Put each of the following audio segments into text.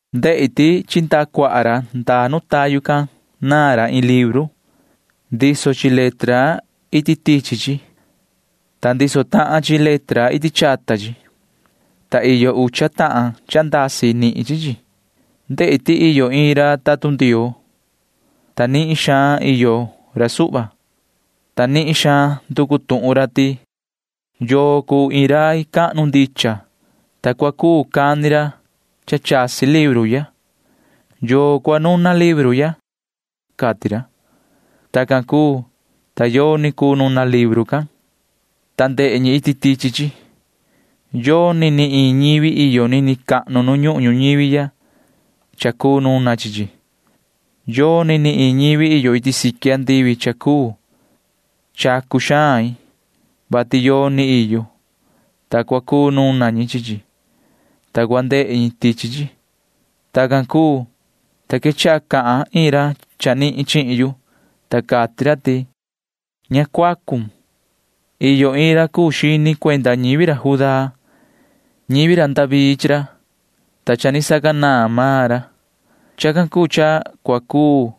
Ndehi ti chi ndaha cuaha ra ndaa nu tayu can naan ra iin libru. Ndiso chi letra iti tichi chi, ta ndiso tahan chi letra iti chata chi, ta iyo ucha tahan cha chasi nihin chi chi. Ndehi ti iyo iin ra tatun Ndioo, ta nihin xaan iyo ra suhva, ta nihin xaan nducu tuhun ra ti: ―¿Yoo cuu iin rai cahnu ndicha, ta cua cuu cani ra cha chasi libru ya? ¿Yoo cua nuna libru ya? ―cati ra. Tacan cuu, ta yoni cuu nuna libru can, ta ndehe ñi iti tichi chi. Yoni ni iin ñivi iyo nini cahnu nu ñuhun ñuñivi ya cha cuu nuna chi chi. Yoni ni iin ñivi iyo iti siqui andivi cha cuu. Chacu xain, vati yoni iyo, ta cua cuu nuna ñi chi chi, ta cua ndehe ñi tichi chi. Tacan cuu, ta quechaha cahan iin ra chanihin chihin yu, ta cati ra ti: ―Ña cuacun. Iyo iin ra cuu xini cuenda ñivi ra Judá. Ñivi ra David chi ra, ta cha ni sacanaan maan ra. Chacan cuu cha cua cuu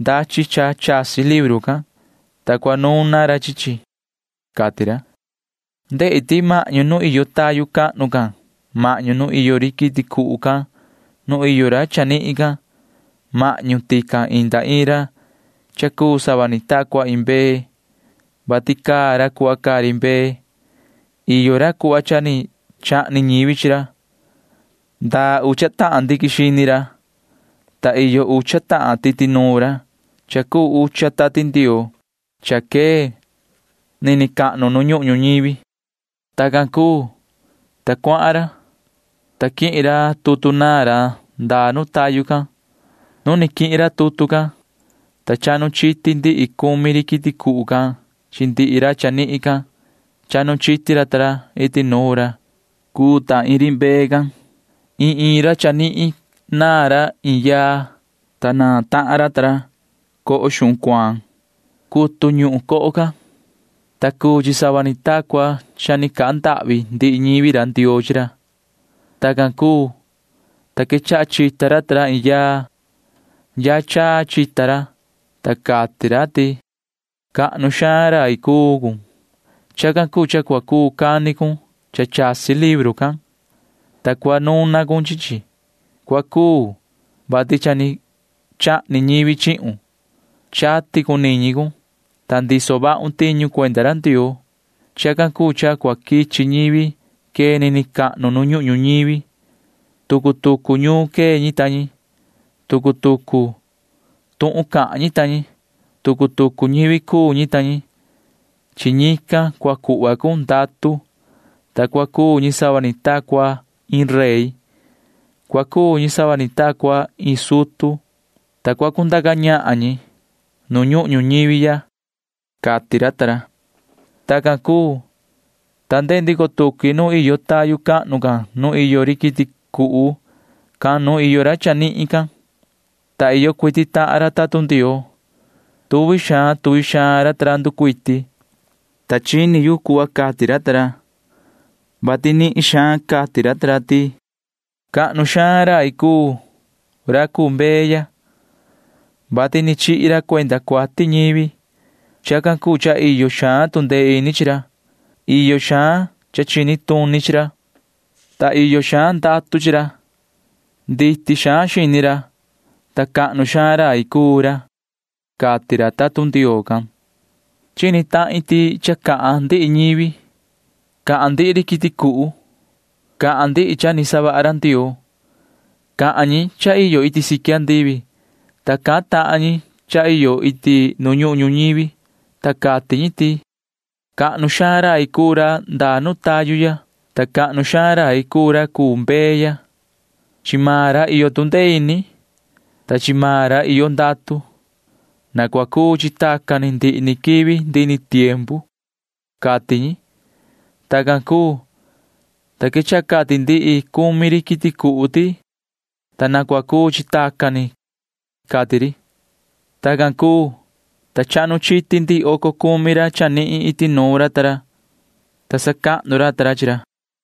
ndachi cha chasi libru can, ta cua nuna ra chi chi ―cati ra. Ndehi ti mahñu nu iyo tayu cahnu can mahñu nu iyo ri quiti cuhu can nu iyo ra chanihin can―mahñu tican inda iin ra cha cuu sava ni ta cua iin mbee, vati caa ra cuhva caa ri mbee. Iyo ra cuhva cha ni chahni ñivi chi ra. Ndaa ucha tahan ndiquin xini ra, ta iyo ucha tahan titi nuun ra cha cuu ucha Tati Ndioo cha quee nini cahnu nu ñuhun ñuñivi. Tacan cuu, ta cuahan ra, ta quihin ra tutu naan ra ndaa nu tayu can. Nu ni quihin ra tutu can, ta chahnu chiti ndihi cumi ri quiti cuhu can chi ndihi ra chanihin can. Chahnu chiti ra ta ra iti nuun ra cuu ta iin ri mbee can. Iin iin ra chanihin naan ra iin yaa, ta naan tahan ra ta ra coho xuhun cuaan. Cutu ñuhun coho can, ta cuu chi sava ni ta cua cha ni cahan ndahvi ndihi ñivi Ndioo chi ra. Tacan cuu, ta quechaha chita ra ta ra iin yaa. Yaa chaa chita ra, ta cati ra ti: Cahnu xaan rai cuu cun. Chacan cuu cha cua cuu cani cun cha chasi libru can, ta cua nuna cun chi chi. Cua cuu, vati cha ni chahni ñivi chihun. Chati cun niñi cun, ta tiso vahun tiñu cuenda ra Ndioo. Chacan cuu cha cua quichi ñivi quee nini cahnu nu ñuhun ñuñivi. Tucu tucu ñuun quee ñi ta ñi. Tucu tucu tuhun cahan ñi ta ñi. Tucu tucu ñivi cuu ñi ta ñi. Chi ñican cua cuhva cun ndatu, ta cua cuu ñi sava ni ta cua iin rey. Cua cuu ñi sava ni ta cua iin sutu, ta cua cundaca ñahan ñi nu ñuhun ñuñivi ya, cati ra. Tacan cuu, ta ndehe ndico tuqui nu iyo tayu cahnu can nu iyo ri quiti cuhu can nu iyo ra chanihin can, ta iyo cuiti tahan ra tatun Ndioo. Tuvi xaan tuvi xaan ra ta ra nducuiti, ta chini yu cuhva cati ra, vati nihin xaan cati ra ti: Cahnu xaan rai cuu ra cuu mbee ya, vati ni chihi ra cuenda cuati ñivi. Chacan cuu cha iyo xaan tu ndee ini chi ra. Iyo xaan cha chini tuni chi ra, ta iyo xaan ndatu chi ra. Nditi xaan xini ra, ta cahnu xaan rai cuu ra, cati ra tatun Ndioo can. Chini tahin ti cha cahan ndihi ñivi. Cahan ndihi ri quiti cuhu. Cahan ndihi cha ni savaha ra Ndioo. Cahan ñi cha iyo iti siqui andivi, ta cahan tahan ñi cha iyo iti nu ñuhun ñuñivi, ta cati ñi ti: Cahnu xaan rai cuu ra ndaa nu tayu ya, ta cahnu xaan rai cuu ra cuu mbee ya. Chi maan ra iyo tu ndee ini, ta chi maan ra iyo ndatu. Na cua cuu chi tacan ni ndihi ni quivi ndihi ni tiempu, cati ñi. Tacan cuu, ta quechaha cati ndihi cumi ri quiti cuhu ti: ―¡Ta na cua cuu chi tacan ni! ―cati ri. Tacan cuu, ta chahnu chiti ndihi oco cumi ra chanihin iti nuun ra ta ra, ta sacahnu ra ta ra chi ra.